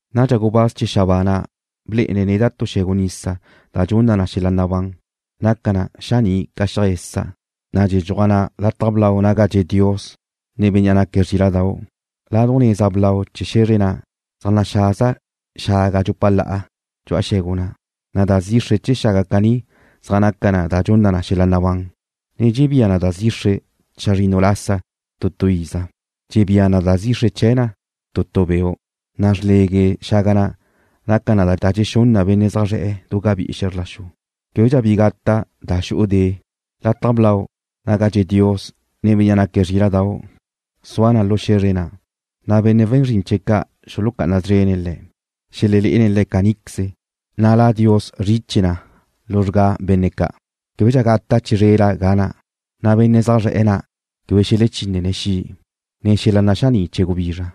Nadxa gubáz chee̱ xabáa na' blé'ene̱' neda' tu xe̱gu nisa da dxunna na xel-la' nabán. Naca na xaní' ca xiaj esa', na' dxedxuaj na lataj blau naga zaj dxe' Dios, ne Bénnea' naque̱' Zríla'dau'. Laduj neza blau chee̱ xe̱zre na' zaj naxaza xaga dxupa la'a dxu'a xe̱gu na', na' da zixre chee̱ xaga caní zaj naca na da dxunna na xel-la' nabán, ne dxebía na da zixre chazrinnu lasa tu tu iza. Dxebía na da zixre chee̱ na tu tu beu', na' xrlegue xaga na' naca na da dxexún na benne' zaj zre̱'e̱ du gabí'i xe̱zr la xu. Québedxa bi gata' da xu'u de'. Lataj blau naga zaj dxe' Dios, ne Bénnea' naque̱' Zríla'dau' sua na lu xe̱zre na', na' benne' we̱n zrin chee̱' ca' xulucá'ana szrene̱' Le̱'. Xelelé'ene̱' Le̱' caníqueze, na' La Dios zriche na luzrgá benne' ca'. Québedxa gata' chizrela ga na', na' benne' zaj zre̱'e̱ na' quebe xelechinne̱' xi', ne xel-la' naxaní' chee̱ gubizra,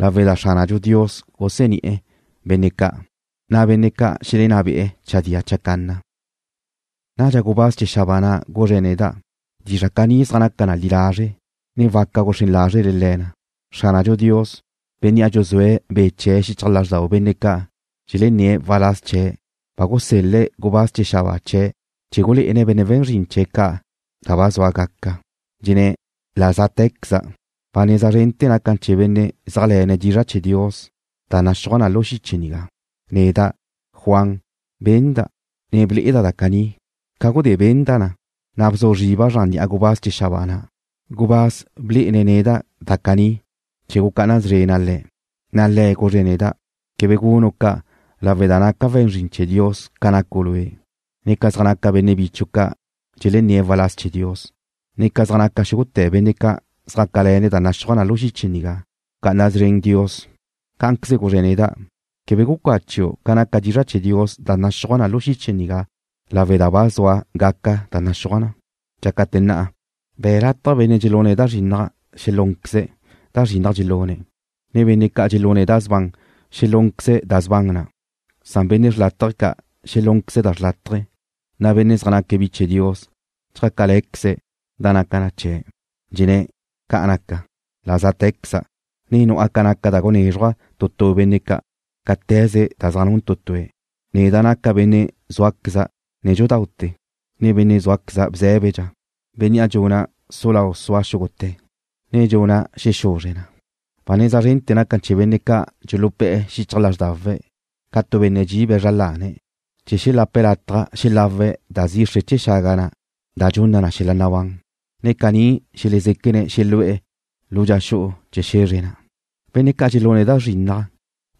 lawe' da Xránadxu Dios guseni'e̱ benne' ca', na' benne' ca' xelenná be'e̱ chadía chacanna. Nadxa gubáz chee̱ xabáa na' guzre̱' neda': ―Dizra' caní zaj naca na li lazre', ne waca guxrén lázrele le̱ na. Xránadxu Dios, Bénnea' dxuzúe̱' Be' chee̱' xichaj lázrdau benne' ca' dxelenné̱' waláz chee̱' ba gusel-le̱' gubáz chee̱ xabáa chee̱' chee̱ gulé'ene̱' benne' we̱n zrin chee̱' da ba zua gaca, dxenné̱': “La zátequeza'. Ba neza zrente̱ naca na chee̱ benne' zéajle̱ne̱' dizra' chee̱ Dios da naxúaj na lu xiche nigá.” Neda', Juan, benda', ne ble'eda' da caní. Ca gudé benda' na, na' bzu zriba' zran ni'a gubáz chee̱ xabáa na', gubáz blé'ene̱' neda' da caní chee̱ gucá'ana szrena' le̱'. Na' le̱' guzre̱' neda': ―Quebe gunu' ca' lawe' da naca' we̱n zrin chee̱ Dios ca nacu' lue', ne ca zaj naca benne' bichu' ca' dxelenné̱' waláz chee̱ Dios, ne ca zaj naca xúgute̱ benne' ca' zjácale̱ne̱' ca da naxúaj na lu xiche nigá. Bca'ana szren Dios. Cá'anqueze guzre̱' neda': ―Quebe gucachu' ca naca dizra' chee̱ Dios da naxúaj na lu xiche nigá lawe' da ba zua gaca da naxúaj na. Dxácate̱ na', be̱' lataj benne' dxelune̱' da zrinnaj xelúnqueze̱' da zrinnaj dxelune̱', ne benne' ca' dxelune̱' da sban xelúnqueze̱' da sban na', san benne' xrlátaje ca' xelúnqueze̱' da xrlátaje, na' benne' zaj naque̱' bi chee̱ Dios chjácale̱queze̱' da naca na chee̱'. Dxenné̱': ―Ca' naca. La zátequeza', ne nu'a ca naca da gunézruja' tu tu benne' ca', cáte̱ze da zaj nun tu tue̱'. Neda' naca' benne' zúaqueza' nédxudaute̱, ne benne' zúaqueza' bzé̱bedxa, bénnea' dxuna' su lau sua xúgute̱, ne dxuna' xexuzre na. Ba neza zrente̱ naca na chee̱ benne' ca' dxulupé̱'e̱ xichaj lázrdawe̱' ca tu benne' dxibe̱' zra lane̱', chee̱ xelape̱' lataj xelawe̱' da zixre chee̱ xaga da dxunna na xel-la' nabán, na' caní xelezéquene̱' xelu'e̱ lu dxa xu'u chee̱ xe̱zre na'. Benne' ca' dxelune̱' da zrinnaj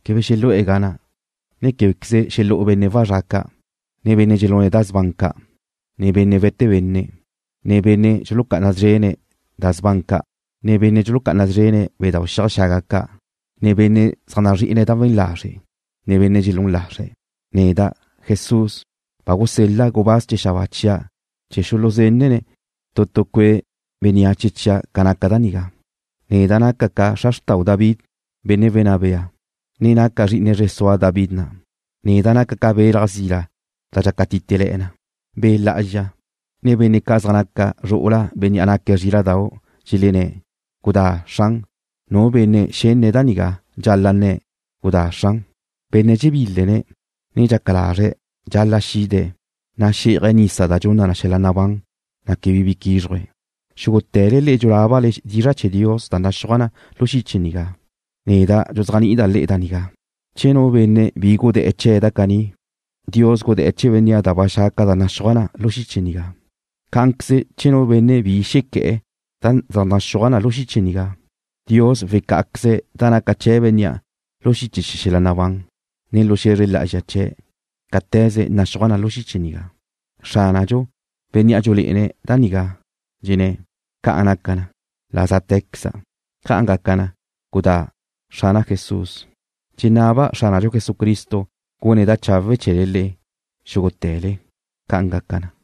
quebe xelu'e̱ ga na', ne québequeze xelú'u benne' wazrá' ca', ne benne' dxelune̱' da sban ca', ne benne' we̱te benne', ne benne' dxulucá'ana szrene̱' bedau' xiaj xaga ca', ne benne' zaj nazri'ine̱' da we̱n lazre', ne benne' dxelún lazre̱'. Neda', Jesús, ba gusel-la' gubáz chee̱ xabáa chia' chee̱ xuluzenne̱' tu tu cue' bénneache chia' ca naca da nigá. Neda' naca' ca xra xrtau David, benne' wenná bea, ne naca' zri'ine zre sua David na'. Neda' naca' ca belaj zila da dxácatitele̱'e̱ na. Be' Lá'azxa, ne benne' ca' zaj naca ca zru'ula Bénnea' naque̱' Zríla'dau', dxelenné̱': ―Gudá, Xran. Nu benne' xenne̱' da nigá dxal-la' nne̱': ―Gudá, Xran. Benne' dxebílene̱', ne dxaca lazre̱' dxal-la' xide̱', na' xí'aje̱' nisa da dxunna na xel-la' nabán, na' quebe bi quízruje̱'. Xúgute̱le le'e dxulábale dizra' chee̱ Dios da naxúaj na lu xiche nigá, neda' dxuzéajni'ida' le'e da nigá: Che nu benne' bi gudé̱'e̱ chee̱ da caní, Dios gudé̱'e̱ chee̱ bénnea' da ba xa' ca' da zaj naxúaj na lu xiche nigá. Cá'anqueze che nu benne' bi xequé̱'e̱ chee̱ da zaj naxúaj na lu xiche nigá, Dios wecá'aqueze̱' da naca chee̱ bénnea' lu xiche chee̱ xel-la' nabán, ne lu xe̱zre lá'azxa chee̱', cáte̱ze naxúaj na lu xiche nigá. Xránadxu, Bénnea' dxulé'ene̱' da nigá, dxenné̱': ―Ca' naca na. La záte̱queza'. ¡Ca' gaca na! ¡Gudá, Xrana' Jesús! Dxenaba' Xránadxu Jesucristo gune̱' da chawe' chee̱le le'e, xúgute̱le. ¡Ca'an gaca na!